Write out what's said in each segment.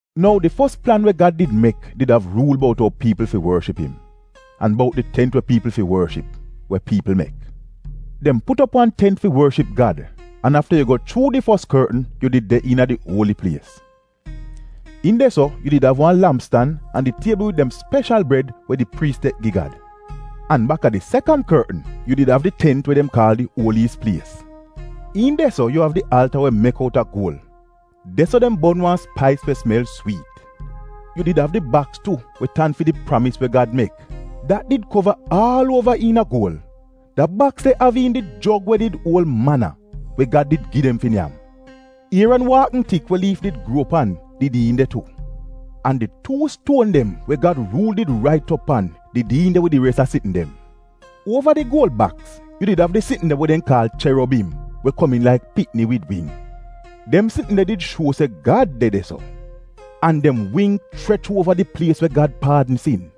Nou di fos plan we Gad did mek did av ruul bout ou piipl fi worship im, an bout di tent we we piipl fi worship, we piipl mek. Dem put op wan tent fi worship Gad an afta yu go chuu di fos kortn yu did de iina di Uoli Plies. Iin de-so, yu did av wan lampstan an di tiebl wid dem speshal bred we di priis tek gi Gad. An baka di sekan kortn yu did av di tent we dem kaal di Uoliyis Plies. Iin de-so yu av di alta we mek outa guol. De-so dem bon wan spais we smel swiit. Yu did av di baks tu, we tan fi di pramis we Gad mek, dat did kova aal uova iina guol. Da baks de av iin di jog we did uol mana, we Gad did gi dem fi nyam. Ieran waakn tik we liif did gruo pan did iin de tu. An di tuu stuon dem we Gad ruul did rait op pan did iin de wid di res a sitn dem. Uova di guol baks yu did av di sitn dem we dem kaal ‘cherobim’ we komiin laik pikni wid wing. Dem sitn de did shuo se Gad de de-so. An dem wing chrech uova di plies we Gad paadn sin.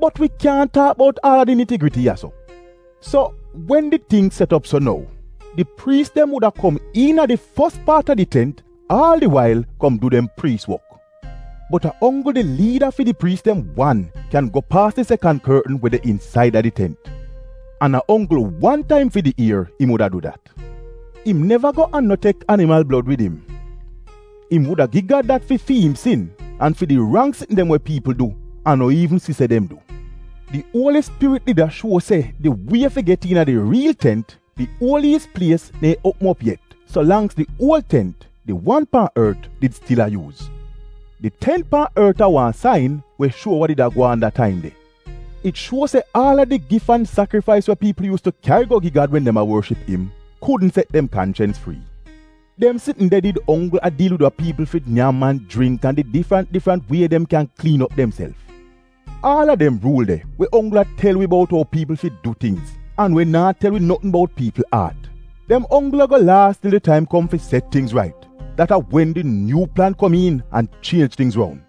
Bot wi kyaahn taak bout aal a di niti-griti ya-so. So, wen di ting set op so nou, di priis dem wuda kom iina di fos paat a di tent aal di wail kom du dem priis wok. Bot a onggl di liida fi di priis dem wan go paas di sekan kortn we de insaida di tent, an a onggl wan taim fi di ier im wuda du dat. Im neva go an no tek animal blod wid im. Im wuda gi Gad dat fi fi im sin an fi di rang sitn dem we piipl du an no iivn si se dem du. Di Uoli Spirit did a shuo se di wie fi get iina di riil tent, di Uoliyis Plies neehn uopm op yet, so langks az di uol tent — di wan pan ort, did stil a yuuz. Di tent pan ort a wan sain we shuo we did a gwaan da taim de. It shuo se aal a di gif an sakrifais we piipl yuuz tu kyari go gi Gad wen dem a worship im kudn set dem kanchens frii. Dem sitn de did onggl a diil wid wa piipl fi nyam an jringk an di difrant difrant wie dem kyan kliin op demself. Aal a dem ruul de, we onggl a tel wi bout ou piipl fi du tingz, an we naa tel wi notn bout piipl aat, dem onggl ago laas til di taim kom fi set tingz rait. Dat a wen di nyuu plan kom iin an chienj tingz roun.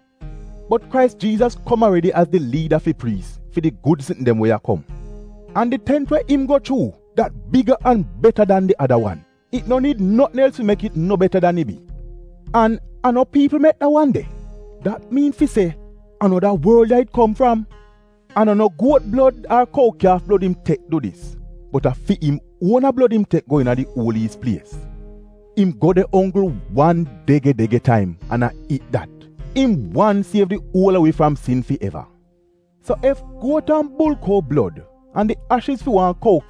Bot Krais Jiizas kom aredi az liida fi priis fi di gud sitn dem we a kom. An di tent we im go chuu, dat biga an beta dan di ada wan. It no niid notn els fi mek it no beta dan it bi. An a no piipl mek da wan de. Dat miin fi se a no da worl ya it kom fram. An a no guot blod ar kou kyaaf blod im tek du dis. Bot a fi im uona blod im tek go iina di Uoliyis Plies. Im go de onggl wan dege-dege taim an a it dat — im wan siev di uol a wi fram sin fi eva! So, ef guot an bulkou blod an di ashiz a wan biebi kou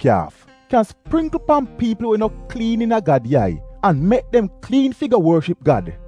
kyan springkl pan piipl we no kliin iina Gad yai an mek dem kliin fi go worship Gad,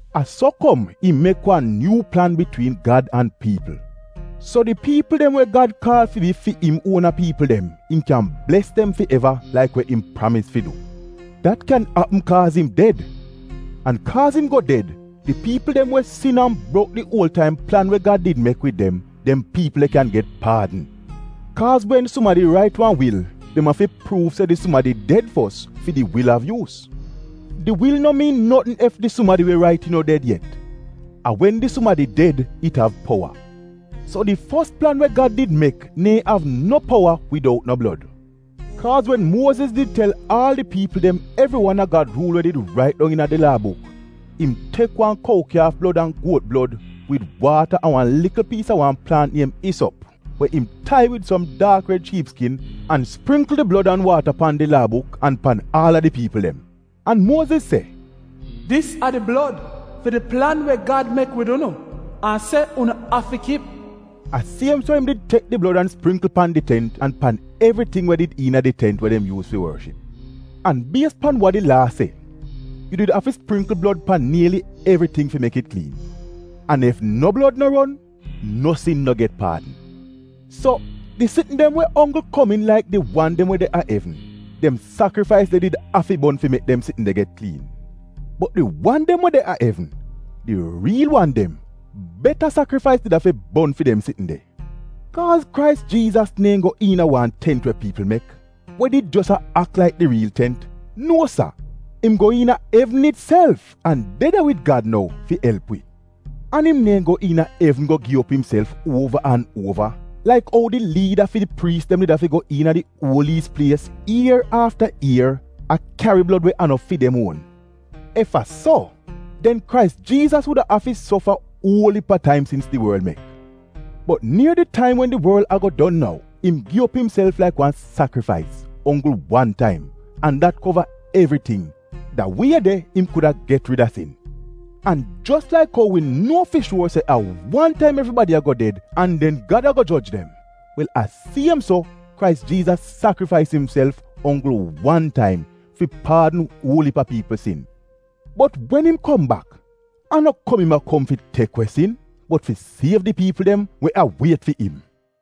A so kom im mek wan nyuu plan bitwiin Gad an piipl. So di piipl dem we Gad kaal fi bi fi im uona piipl dem im kyan bles dem fi eva laik we im pramis fi du. Dat kyan apm kaaz im ded, an kaaz im go ded di piipl dem we sin an brok di uol taim plan we Gad did mek wid dem, dem piipl de kyan get paadn. Kaaz wen sumadi rait wan wil, dem afi pruuv se da sumadi de ded fos fi di wil av yuus. Di wil no miin notn ef di sumadi we rait it no ded yet — a wen di sumadi ded nou it av powa. So di fos plan we Gad did mek neehn av no powa widoutn blod. Kaaz wen Muoziz did tel aal di piipl dem evri wan a Gad ruul we did rait dong iina di Laa Buk. Im tek wan biebi kou blod an guot blod, wid waata an wan likl piis a wan plaant niem isop, we im tai wid som daak red shiip skin an springkl di blod an waata pan di Laa Buk an pan aal a di piipl dem. An Muoziz se, ‘Dis a di blod fi di plan we Gad mek wid unu, an se unu afi kip.’ A siem so im tek di blod an springkl pan di tent an pan evriting we did iina di tent we dem did yuuz fi worship. An bies pan wa di laa se, yu did afi springkl blod pan nieli evriting fi mek it kliin; an ef no blod no ron, no sin no get paadn. So, di sitn dem we onggl komiin laik di wan dem we de a evn, dem sakrifais de did afi bon fi mek dem sitn de get kliin. Bot di wan dem we de a evn — di riil wan dem, beta sakrifais di afi bon fi dem sitn de. Kaaz Krais Jiizas neehn go iina wan tent we piipl mek, we did jos a ak laik di riil tent — nuo sa. Im go iina evn itself an de de wid Gad nou, fi elp wi. An im neehn go iina evn go gi op imself uova an uova laik ou di liida fi di priis dem did afi go iina di Uoliyis Plies ier afta ier a kyari blod we a no fi dem uon. Ef a so, den Krais Jiizas wuda afi sofa uol iip a taim sins di worl mek. Bot nier di taim wen di worl ago don nou, im gi op imself laik wan sakrifais, onggl wan taim, an dat kova evriting. Da wie de im kuda get rida sin. An jos laik ou wi nuo fi shuor se a wan taim evribadi ago ded an den Gad ago joj dem, wel a siem so, Krais Jiizas sakrifais imself onggl wan taim fi paadn uol iip a piipl sin. Bot wen im kom bak a no kom im a kom fi tek we sin bot fi siev di piipl dem we a wiet fi im.